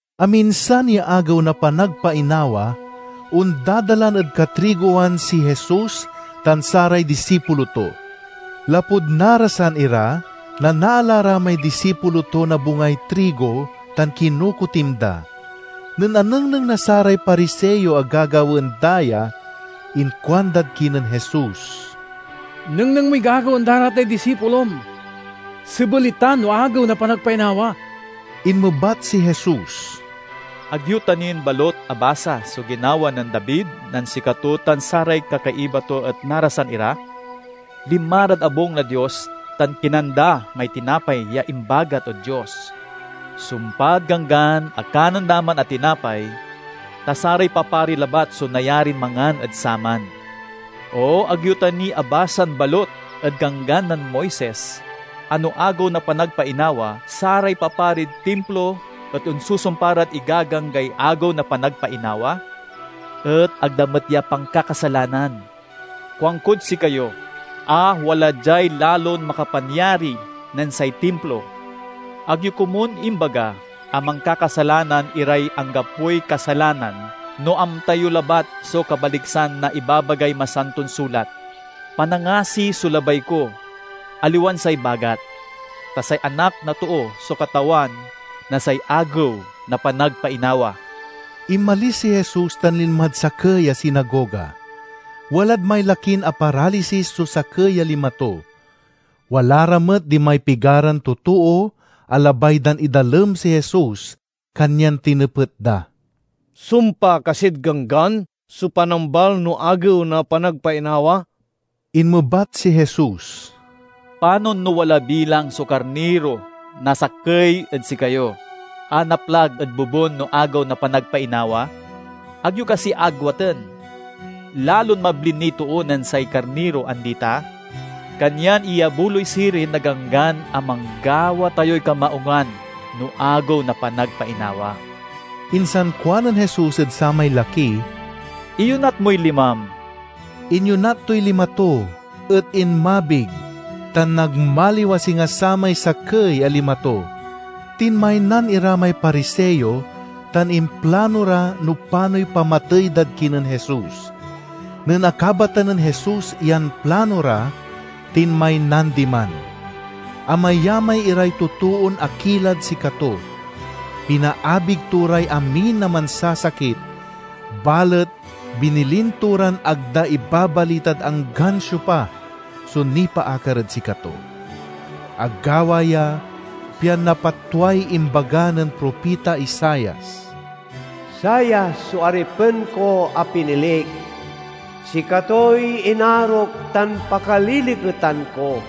Aminsan ya Agew na Panagpainawa, ondadalan ed katrigowan si Jesus tan saray disipulo to. Lapud narasan ira, nanaala ra may disipulo to na bungay trigo tan kinokotim da. Nen anengneng na saray Pariseo a gagawaen da ya, inkuandad kinen Jesus, "Nengneng moy gagawaen da ra tay disipulom. Sebel itan no Agew na Panagpainawa!" Inmebat si Jesus, "Ag yo ta nin balut abasa so ginawa nen David nen sikato tan saray kakaiba to et narasan ira? Linma rad abung na Dios tan kinan da may tinapay ya imbagat ed Dios. Sumpad Ganggan a kanen da man a tinapay, ta saray papari labat so nayarin mangan ed saman. O ag yo ta ni abasan balut ed Ganggan nen Moises a no Agew na Panagpainawa saray paparid Timplo et onsusumpa rad igaganggay Agew na Panagpainawa? Et ag da met ya pankakasalanan! Kuankod sikayo a wala diay lalon makapanyari nen say Timplo. Ag yo komun imbaga a mankakasalanan iray anggapoy kasalanan no amta yo labat so kabaliksan na ibabagay Masanton Sulat, 'Panangasi so labay ko, aliwan say bagat.' Ta say Anak na Too so Katawan na say Agew na Panagpainawa." Inmalis si Jesus tan linmad sakey a sinagoga. Walad may lakin aparalisis so sakey a lima to. Wala ra met dimay pigaran totoo a labay dan idalem si Jesus kanyan tinepet da, "Sumpa kasid Ganggan so panambal no Agew na Panagpainawa?" Inmebat si Jesus, "Panon no wala bilang so karniro na sakey ed sikayo a naplag ed bobun no Agew na Panagpainawa? Ag yo kasi agwaten? Lalon mabli niy too nen say karniro, andi ta? Kanyan iyabuloy sirin na Ganggan a manggawa tayoy kamaungan no Agew na Panagpainawa." Insan kuanen Jesus ed samay laki, "Iyonat moy limam." Inyonat toy lima to, et inmabig tan nagmaliw a singa samay sakey a lima to. Tinmaynan ira may Pariseo tan implano ra no panoy pamatey dad kinen Jesus. Nen akabatan nen Jesus yan plano ra, tinmaynan diman. Amayamay iray totoon akilad sikato. Pinaabig to ray amin a mansasakit, balet binilin to ran ag da ibabalitad anggan siopa so nipaakar ed sikato. Agawa ya pian napatway imbaga nen propita Isaias: "Sava so aripen ko a pinilik, sikatoy inarok tan pakaliliketan ko.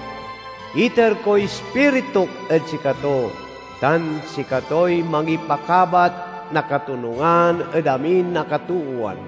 Iter koy Ispirituk ed sikato, tan sikatoy mangipakabat na katonungan ed amin a katoowan.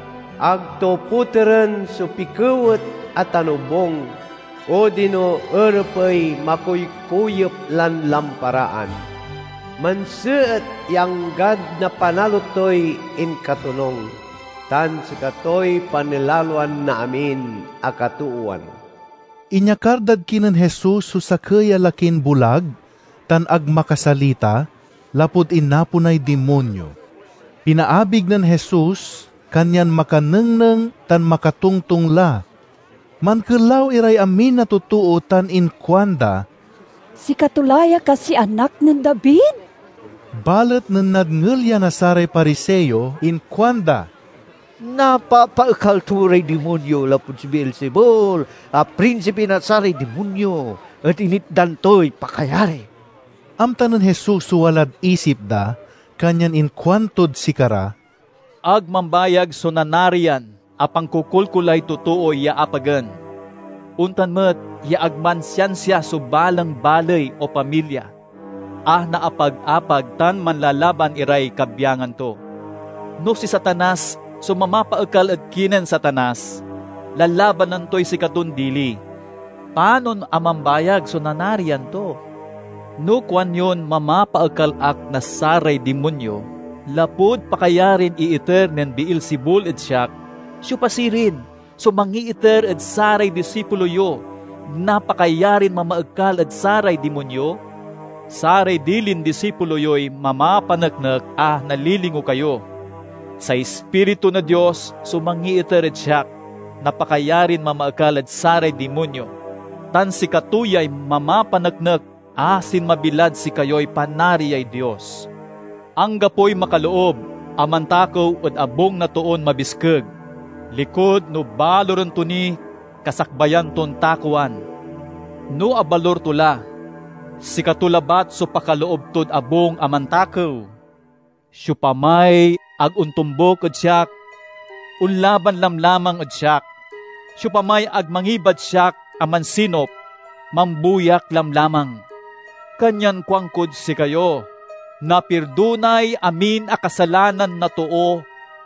Ag to poteren so pikewet a tanobung, odino erepey makuykuyep lan lamparaan. Manseet ya anggad napanalo toy inkatonung: tan sikatoy panilaloan na amin a katoowan." Inyakar dad kinen Jesus so sakey a lakin bulag tan ag makasalita lapud inaponay dimonyo. Pinaabig nen Jesus, kanyan makanengneng tan makatongtong la. Mankelaw iray amin a totoo tan inkuanda, "Sikato la ya kasiy Anak nen David?" Balet nen nadngel ya na saray Pariseo inkuanda, "Napapaekal to ray dimonyo lapud si Beelzebul a prinsipi na saray dimonyo et initdan toy pakayari." Amta nen Jesus so walad isip da, kanyan inkuantod sikara, "Ag mambayag so nanarian a pankokolkolay totoo ya apagen. Ontan met ya ag mansiansia so balang baley o pamilya a naapag-apag tan manlalaban iray kabyangan to. No si Satanas so mamapaekal ed kinen Satanas, lalabanan toy sikaton dili! Panon a mambayag so nanarian to? No kuanyon mamapaekal ak na saray dimonyo lapud pakayarin iiter nen Beelzebul ed siak, siopa sirin so mangiiter ed saray disipulo yo na pakayarin mamaekal ed saray dimonyo? Saray dilin disipulo yoy mamapaneknek a nalilingo kayo! Say Ispiritu na Dios so mangiiter ed siak na pakayarin mamaekal ed saray dimonyo, tan sikato yay mamapaneknek a sinmabi lad sikayoy Panariay Dios. "Anggapoy makaloob a mantakew ed abung na toon mabiskeg, likud no baluren to ni kasakbayan ton takewan. No abalur to la, sikato labat so pakaloob tod abung a mantakew. "Siopamay ag ontombuk ed siak, onlaban lamlamang ed siak. Siopamay ag mangibad siak a mansinup, mambuyak lamlamang. Kanyan kuankod sikayo: napirdonay amin a kasalanan na too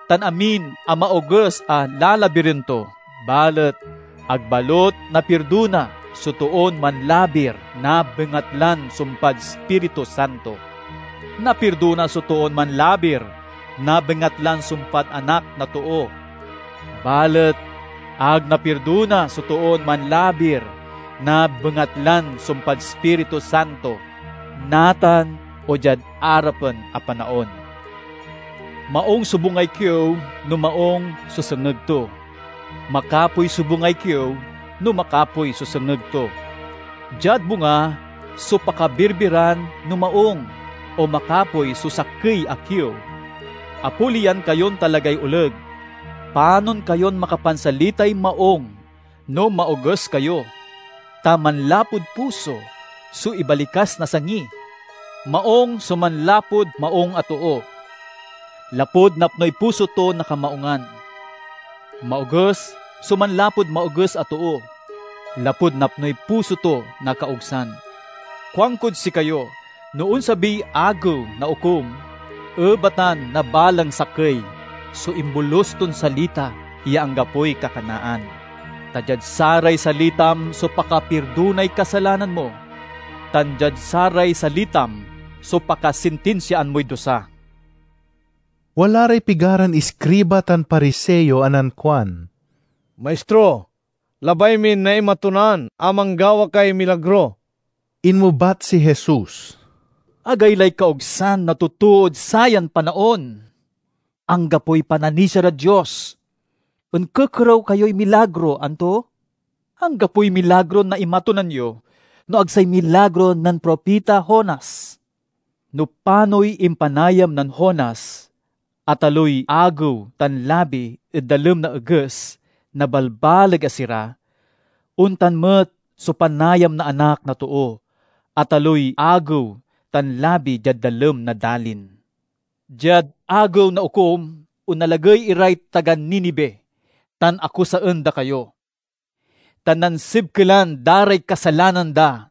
tan amin a maoges a lalabiren to balet ag balut napirdona so toon manlabir na bengatlan sumpad Ispiritu Santo. Napirdona so toon manlabir na bengatlan sumpad Anak na Too; balet ag napirdona so toon manlabir na bengatlan sumpad Ispiritu Santo, natan o diad arapen a panaon." Maung so bungay kiew no maung so sengeg to; makapoy so bungay kiew no makapoy so sengeg to. Diad bunga so pakabirbiran no maung o makapoy so sakey a kiew. Apoliyan kayon talagay oleg! Panon kayon makapansalitay maung no maoges kayo? Ta manlapud puso so ibalikas na sangi! Maung so manlapud maung a too, lapud napnoy puso to na kamaungan. Maoges so manlapud maoges a too, lapud napnoy puso to na kaogsan. "Kuankod sikayo: no onsabiy Agew na Okum, ebatan na balang sakey so imbolus ton salita ya anggapoy kakanaan. Ta diad saray salitam so pakapirdonay kasalanan mo, tan diad saray salitam so pakasintinsiaan moy dusa." Wala ray pigaran iskriba tan Pariseo a nankuan, "Maistro, labay min naimatunan a manggawa kay milagro." Inmebat si Jesus, "Agaylay kaogsan na totood sayan panaon! Anggapoy pananisia rad Dios! Onkekerew kayoy milagro, anto? Anggapoy milagron naimatunan yo no ag say milagro nen propita Jonas. No panoy impanayam nen Jonas a taloy agew tan labi ed dalem na eges na balbaleg a sira, ontan met so panayam na Anak na Too a taloy agew tan labi diad dalem na dalin. Diad Agew na Okum onalagey iray taga Ninive tan akusaen da kayo, ta nansibkelan da ray kasalanan da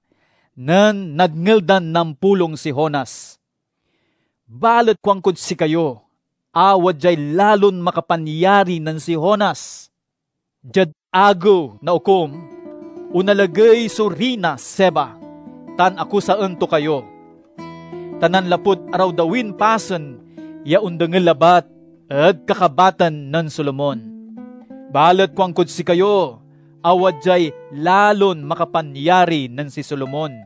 nen nadngel dan nampulong si Jonas. Balet kuankod sikayo a wadyay lalon makapanyari nen si Jonas! Diad Agew na Okum onalagey so Riyna Seba tan akusaen to kayo, ta nanlapud arawdawin pasen ya ondengel labat ed kakabatan nen Solomon. Balet kuankod sikayo a wadyay lalon makapanyari nen si Solomon!"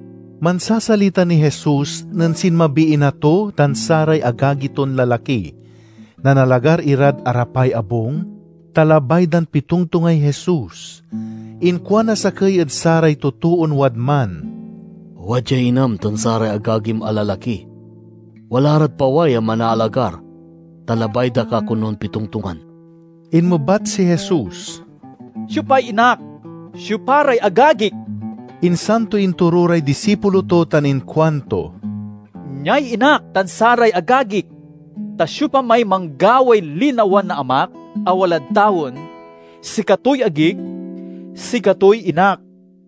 Mansasalita niy Jesus nen sinmabiy ina to tan saray agagi ton lalaki. Nanalagar irad arapay abung, ta labay dan pitongtongay Jesus. Inkuan na sakey ed saray totoon wadman, "Wadyay inam tan saray agagim a lalaki. Wala rad paway a manaalagar, ta labay da ka konon pitongtongan." Inmebat si Jesus, "Siopay inak? Siopa ray agagik?" Insan to intoro ray disipulo to tan inkuanto, "Niay inak tan saray agagik! Ta siopamay manggaway linawa na Amak a walad tawen, sikatoy agik, sikatoy inak."